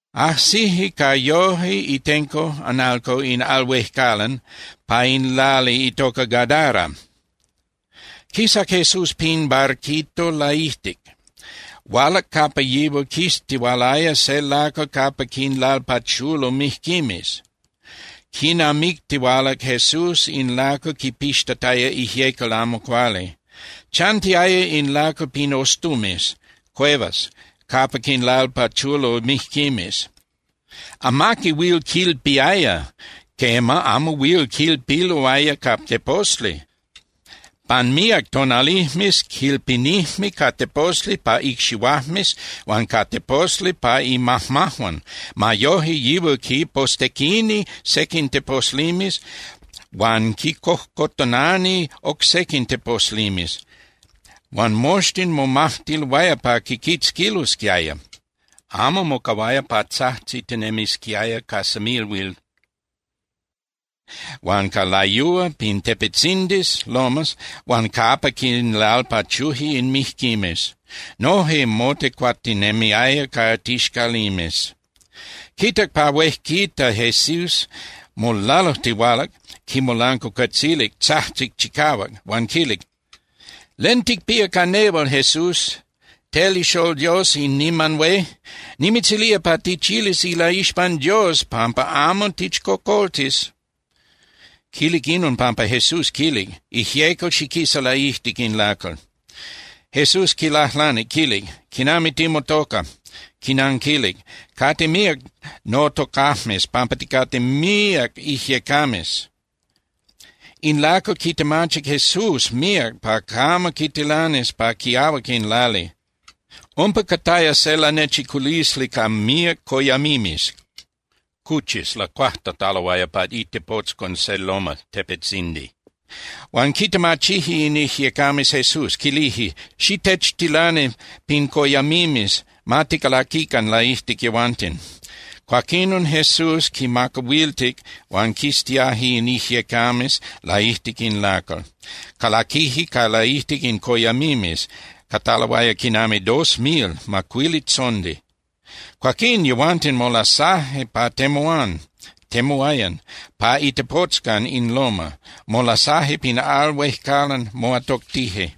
Ajsije ca yoje itenco (analco) in al huejcalan pa in lali itocac Gadara. Quisac Jesús pin barquito laijtic. Hualac capa yihual quistihualaya se lacal capa quinlalpachulo mijquimes, quinamictihualac Jesús in lacal quipixtataya ijyecal amo cuali. Chantiaya in lacal pin ostumes (cuevas) capa quinlalpachulo mijquimes. Amaqui huil quilpiaya, quema, amo huil quilpiloaya ca teposli. Pan míac tonalijmes quilpinijme ca teposli pa icxihuajmes huan ca teposli pa imajmajuan. Ma yoje yihual quipostequini sequin teposlimes huan quicojcotonani oc sequin teposlimes huan moxtin momajtiloaya pa quiquitzquilosquiaya. Amo mocahuaya pa tzajtzitinemisquiaya ca semilhuil huan ca layúa pin tepetzindis (lomas) huan capa quinlalpachuje in mijquimes. Noje motecuatinemiaya ca tixcalimes. Quitac pa huejquita Jesús, molalujtihualac, quimolancuacuetzilic, tzajtzic chicahuac. Huan quilic: —¿Len ticpía ca nehual, Jesús, tel ixól Dios in niman hué? ¡Nimitzilía pa tichilis ilaixpan Dios pampa amo tichcocoltis! Quilic inon pampa Jesús quilic: —¡Ijyecal, xiquisa laijtic in lacal! Jesús quilajlanic, quilic: —¿Quinami timotoca? Quinanquilic: —Cate míac notocajmes pampa ticate míac ijyecames. In lacal quitemachic Jesús míac pa camo quitilanis pa quiahuac in lali. Umpa cataya se lanechiculisli ca míac coyamimes (cuchis) lacuajtataloaya pa itepotzcon se loma (tepetzindi). Huan quitemachije in ijyecames Jesús, quilije: —Xitechtilani pin coyamimes, ma ticalaquican laijtic yehuanten. Cuaquinon Jesús quinmacahuiltic huan quistiaje in ijyecames laijtic in lacal. Calaquije ca laijtic in coyamimes, cataloaya quinami dos mil (macuilitzondi). Cuaquín yehuanten molasaje pa temuán (temuayan) pa itepotzcon in loma, molasaje pin al huejcalan, moatoctije.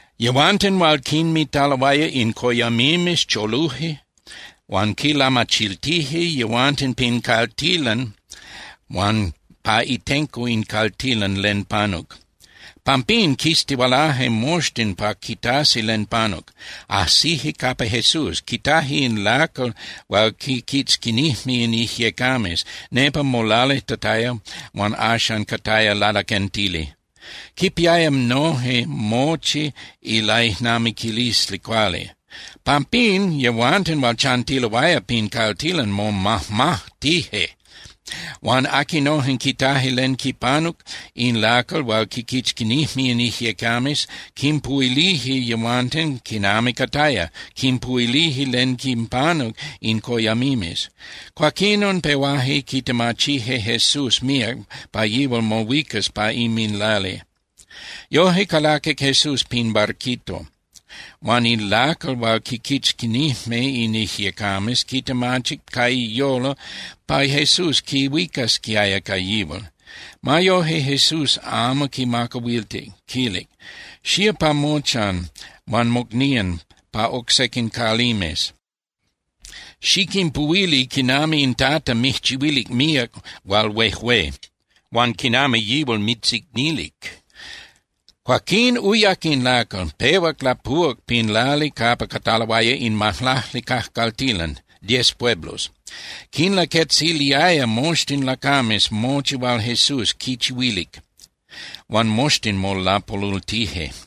Yehuanten hual quinmitaloaya in coyamimes choluje huan quinlamachiltije yehuanten pin caltilan huan pa itenco in caltilan len panuc. Pampín quistihualaje moxtin pa quitasi len panuc. Ajsije capa Jesús, quitaje in lacal hual quiquitzquinijme in ijyecames. Nepa molalijtataya huan axan cataya lalaquentili. Quipiaya noje mochi ilaijnamiquilisli cuali. Pampín yehuanten hual chantiloaya pin caltilan momajmajtije. Huan aquinojen quitaje len quipanuc in lacal hual quiquitzquinijme in ijyecames quinpuhuilije yehuanten quinami cataya, quinpuhuilije len quinpanuc in coyamimes. Cuaquinon pehuaje quitemachije Jesús míac pa yihual mohuicas pa inminlali. Yoje calaquic Jesús pin barquito. Huan in lacal hual quiquitzquinijme in ijyecames quitemachic ca iyolo pa Jesús quihuicasquiaya ca yihual. Ma yoje, Jesús amo quimacahuiltic. Quilic: —Xía pa mochan huan mocnían pa oc sequin calimes, xiquinpuhuili quinami in Tata mijchihuilic míac hual huejué, huan quinami yihual mitzicnilic. Cuaquín uyac in lacal, pehuac lapuhuac pin lali capa cataloaya in Majlacli Cajcaltilan (Diez Pueblos). Quinlaquetziliaya moxtin lacames mochi hual Jesús quichihuilic. Huan moxtin molapolultije.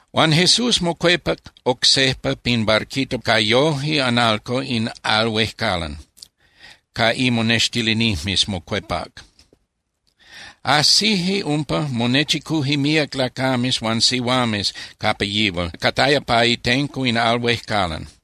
Huan Jesús mocuepac oc sejpa pin barquito ca yoje (analco) in al huejcalan, ca imonextilinijmes mocuepac. Ajsije umpa, monechicuje míac lacames huan sihuames capa yihual cataya pa itenco in al huejcalan.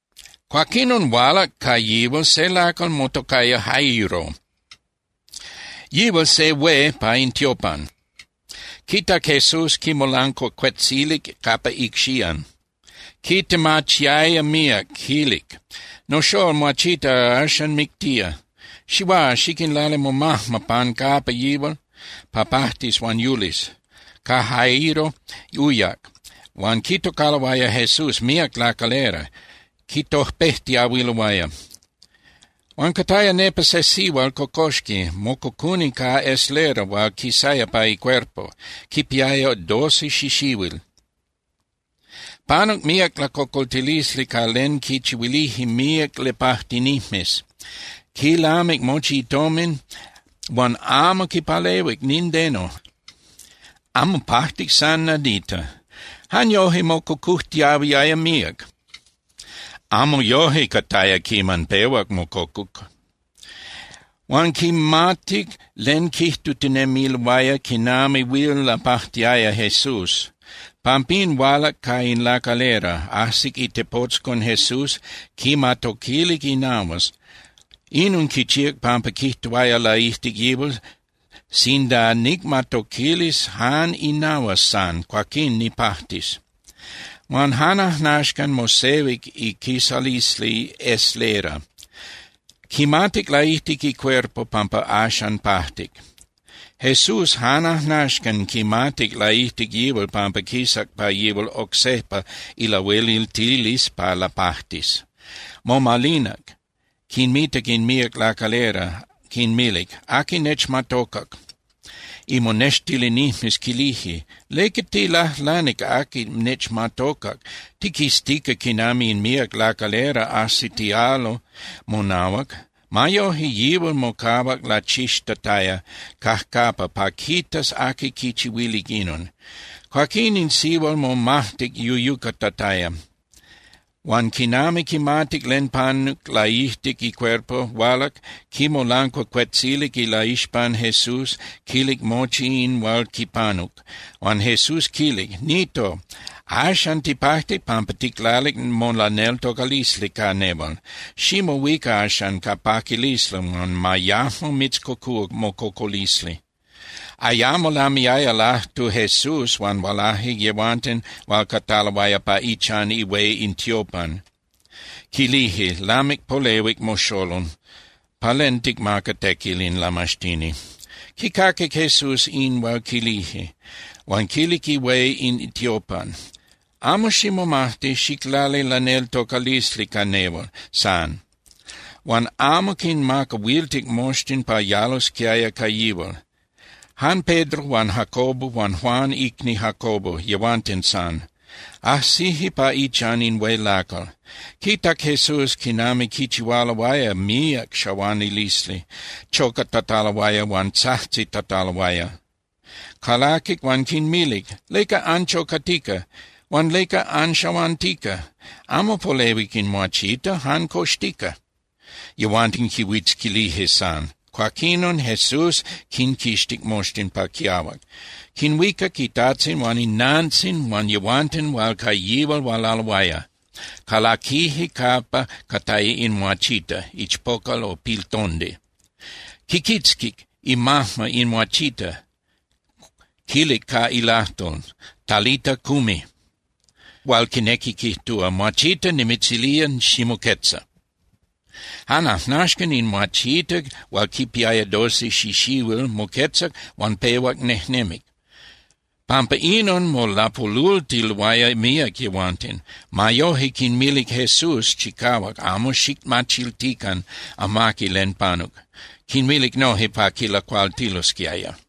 Cuaquinon hualac ca yihual se lacal motocaya Jairo, yihual se hué pa in tiopan. Quitac Jesús, quimolancuacuetzilic capa icxían. Quitemachiaya míac, quilic: —Noxól muachita axan mictía. Xihuá, xiquinlali momajma pan capa yihual pa pajtis huan yulis. Ca Jairo uyac, huan quitocaloaya Jesús míac lacalera, quitojpejtiahuiloaya. Huan cataya nepa se sihual cocoxqui, mococuni ca eslera hual quisaya pa icuerpo, quipiaya doce xixihuil. Panuc míac lacocoltilisli ca len quichihuilije míac lapajtinijmes. Quilamic mochi itomin huan amo quipalehuic nindeno, amo pajtic san nadita. Jan yoje mococujtiahuiaya míac, amo yoje cataya quiman pehuac mococuc. Huan quimatic len quijtutinemiloaya quinami huil lapajtiaya Jesús. Pampín hualac ca in lacalera, ajsic itepotzcon Jesús, quimatoquilic inahuas. Inon quichíac pampa quijtuaya laijtic yihual: “Sinda nicmatoquilis jan inahuas san, cuaquín nipajtis.” Huan jan ajnaxcan mosehuic iquisalisli eslera. Quimatic laijtic icuerpo pampa axan pajtic. Jesús jan ajnaxcan quimatic laijtic yihual pampa quisac pa yihual oc sejpa ilahueliltilisli pa lapajtis. Momalinac, quinmitac in míac lacalera, quinmilic: —¿Aqui nechmatocac? Imonextilinijmes quilije: —¿Leca tilajlanic: “Aqui nechmatocac”? Tiquiztica quinami in míac lacalera ajsitialo monahuac. Ma yoje, yihual mocahuac lachixtataya cajcapa pa quitas aqui quichihuilic inon. Cuaquín in sihual momajtic yuyucatataya. Huan quinami quimatic len panuc laijtic icuerpo, hualac, quimolancuacuetzilic ilaixpan Jesús, quilic mochi in hual quipanuc. Huan Jesús quilic: —Nito, axan tipajtic pampa ticlalic molaneltocalisli ca nehual. Ximohuica axan ca paquilisli huan ma yajmo mitzcocúa mococolisli. Ayamo lamiaya lajtu Jesús, huan hualaje yehuanten hual cataloaya pa ichan ihué in tiopan. Quilije: —Lamic polehuic moxolol, ¿pa len ticmaca tequil in lamaxtini? Quicaquic Jesús in hual quilije, huan quilic ihué in tiopan: —Amo ximomajti, xiclali laneltocalisli ca nehual san. Huan amo quinmacahuiltic moxtin pa yalosquiaya ca yihual, jan Pedro huan Jacobo huan Juan icni Jacobo, yehuanten san. Ajsije pa ichan in hué lacal. Quitac Jesús quinami quichihualoaya míac xahuanilisli, chocatataloaya huan tzajtzitataloaya. Calaquic huan quinmilic: —¿Leca anchocatica? Huan ¿leca anxahuantica? Amo polehuic in muachita, jan coxtica. Yehuanten quihuitzquilije san. Cuaquinon Jesús quinquixtic moxtin pa quiahuac. Quinhuicac itajtzin huan inantzin huan yehuanten hual ca yihual hualaloaya, calaquije capa cataya in muachita (ichpocal o piltondi). Quiquitzquic imajma in muachita, quilic ca ilajtol: —Talita, cumi —hual quinequi quijtúa: Muachita, nimitzilía, ximoquetza. Jan ajnaxcan in muachita hual quipiaya doce xixihuil moquetzac, huan pehuac nejnemic. Pampa inon molapolultiloaya míac yehuanten. Ma yoje, quinmilic Jesús chicahuac: —Amo xicmachiltican amaqui len panuc. Quinmilic noje pa quilacualtilosquiaya.